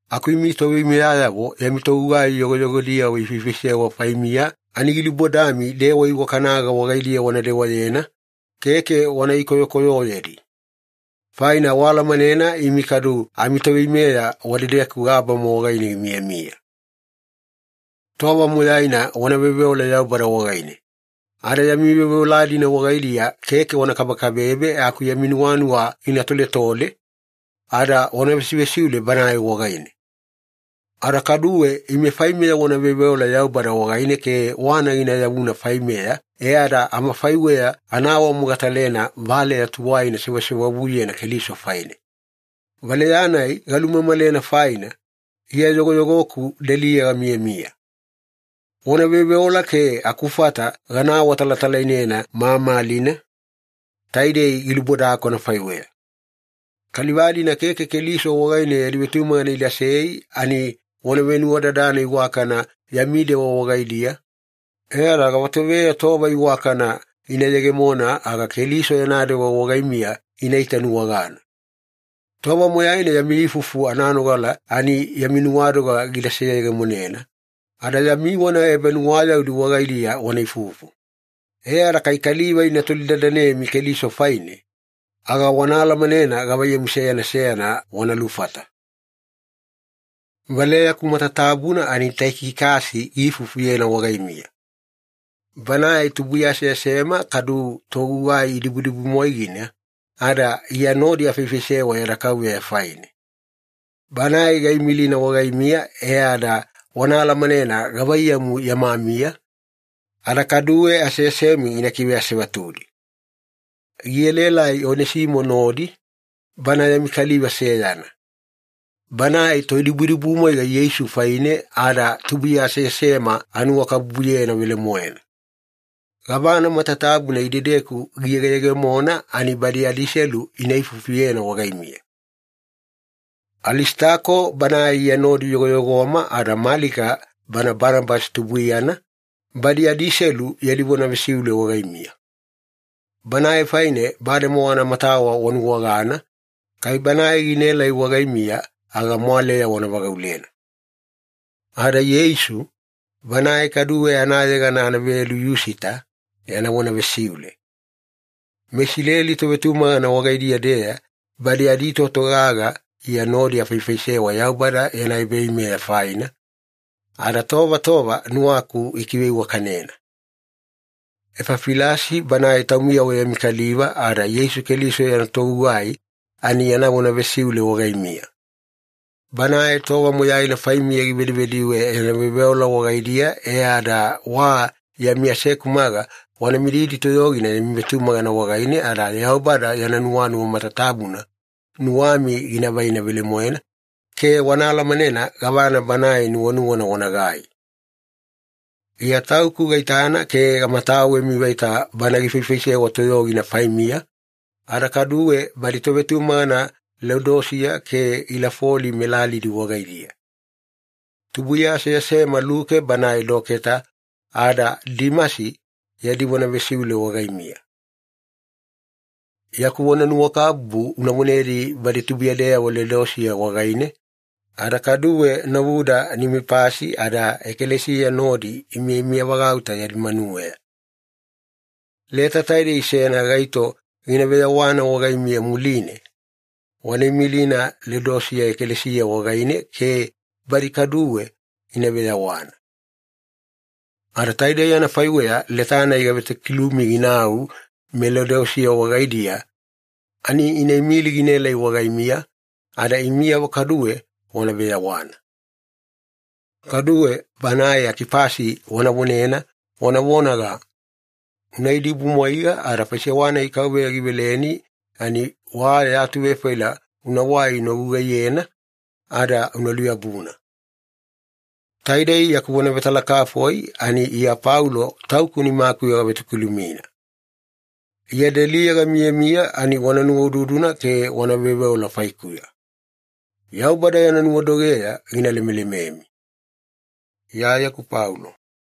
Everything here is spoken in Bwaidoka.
Aku imi toveimeyayavo yami togugai yogoyogodiyavo ifaifaisewa faimiya ani gilubodami dewa iwakanaga wagaidiya wana dewayena, keke wana ikoyokoyoyedi. Faina waalamanena imi kadu amiToveimeya wadedeku gabama wagaine gimiyamiya. Tova moyaina wana veoveola Yaubada wagaine. Ada yami veoveola-dina wagaidiya keke wana kabekabebe aku yami nuwanuwa gina toletole, ada wana vesivesiule Banae wagaine. Ada kaduwe ime faimeya wana veoveola Yaubada wagaine ke wana gina yavuna faimeya e ada amafaiweya ana awamogatalena valeya tuwaina sewasewavuyena Keliso faine. Valeya-nai galumamalena faina, Iya yogoyogoku deliya gamiyamiya. Wana veoveola ke akufata gana awatalatalainena mamalina, taidei gilubodaku anafaiweya. Kaliva-dina keke Keliso wagaine yadi vetumagana idasei ani wana venuwadadana iwakana yami dewa wagaidiya, e ada gavatoveya tova iwakana ina yegemona aga Keliso yana dewa wagaimiya ina itanuwagana. Tova moyaina yami ifufu ananogala ani yami nuwadoga gida seyegemonena, ada yami vona ebanuwayaudi wagaidiya wana ifufu. E ada kai kaliva ina tolidadanemi Keliso faine, aga wana alamanena gavaiyamu seyana seyana wana lufata. Valeyaku matatabuna ani Taikikasi gina ifufuyena wagaimiya. Banae tubuiya aseasema kadu togugai dibudibumwaigina, ada Iya nodi afaifaisewa yada Kauveya faine. Banae gaimilina wagaimiya e ada wana alamanena gavaiyamu yama miya, ada kaduwe aseasemi gina kiveasevatudi. Gielaelai Onesimo nodi, bana yami kaliva seyana. Banae toidibudibumwaiga Yeisu faine ada tubuiya aseasema anuwakabubuyena velemoena. Gavana matatabuna idedeku giyegeyegemona ani badi adiselu ina ifufuyena wagaimiya. Alisitako banae Iya nodi yogoyogoma ada Malika bana Banabasi tubuiyana, badi adiselu yadi vona vesiule wagaimiya. Banae faine bademowa anamatawa wanuwagana, kai banae ginaelai wagaimiya aga mwaleya wana vagaulena. Ada Ieisu, banae kaduwe anayegana anavelu Yusita, yana vona vesiule. MeIsileli tovetumagana wagaidiya-deya badi aditoto gaga Iya nodi afaifaisewa Yaubada yana ebaveimeya faina, ada tova tova nuwaku ikiveiwakanena. Efafilasi banae taumiyavo yami kaliva ada Yeisu Keliso yana togugai ani yana vona vesiule wagaimiya. Banae tova moyaina faimiya givedivediwe yana veoveola wagaidiya e ada wa yami asekumaga wana mididi toyogina yami vetumagana wagaine, ada Yaubada yana nuwanuwa matatabuna nuwami gina vaina velemoena ke wana alamanena gavana Banae nuwanuwana wanagai. Iya tauku gaitana ke gamatawemi vaita bana gifaifaisewa toyogina faimiya, ada kaduwe badi tovetumagana Leodisiya ke Ilafoli melalidi wagaidiya. Tubuiya aseasema Luke banae doketa ada Dimasi yadi vona vesiule wagaimiya. Yaku vonanuwakabubu una vonedi badi tubuiyadeyavo Leodisiya wagaine, ada kaduwe novuda Nimipasi ada ekalesiya nodi imiyamiyavagauta yadi manuweya. Leta taidei seyana gaito gina veyawana wagaimiya muline, wana imilina Leodisiya ekalesiya wagaine ke badi kaduwe ina veyawana. Ada taidei anafaiweya leta-nai gavetokilumi ginau meLeodisiya wagaidiya ani ina imili ginaelai wagaimiya, ada imiyavo kaduwe wana veyawana. Kaduwe banae Akipasi wana vonena wana vonaga, “Una idibumwaiga ada faisewa-nai Kauveya giveleni ani wa ya atuvefaila unawai una gugaiyena, ada una luyabuna.” Taidei yaku vona vetalakafoi ani Iya Paulo tauku nimakuya gavetokilumina. Iya deliya gamiyamiya ani wana nuwaududuna ke wana veoveola faikuya. Yaubada yana nuwadogeya gina lemelememi. Iyayeku Paulo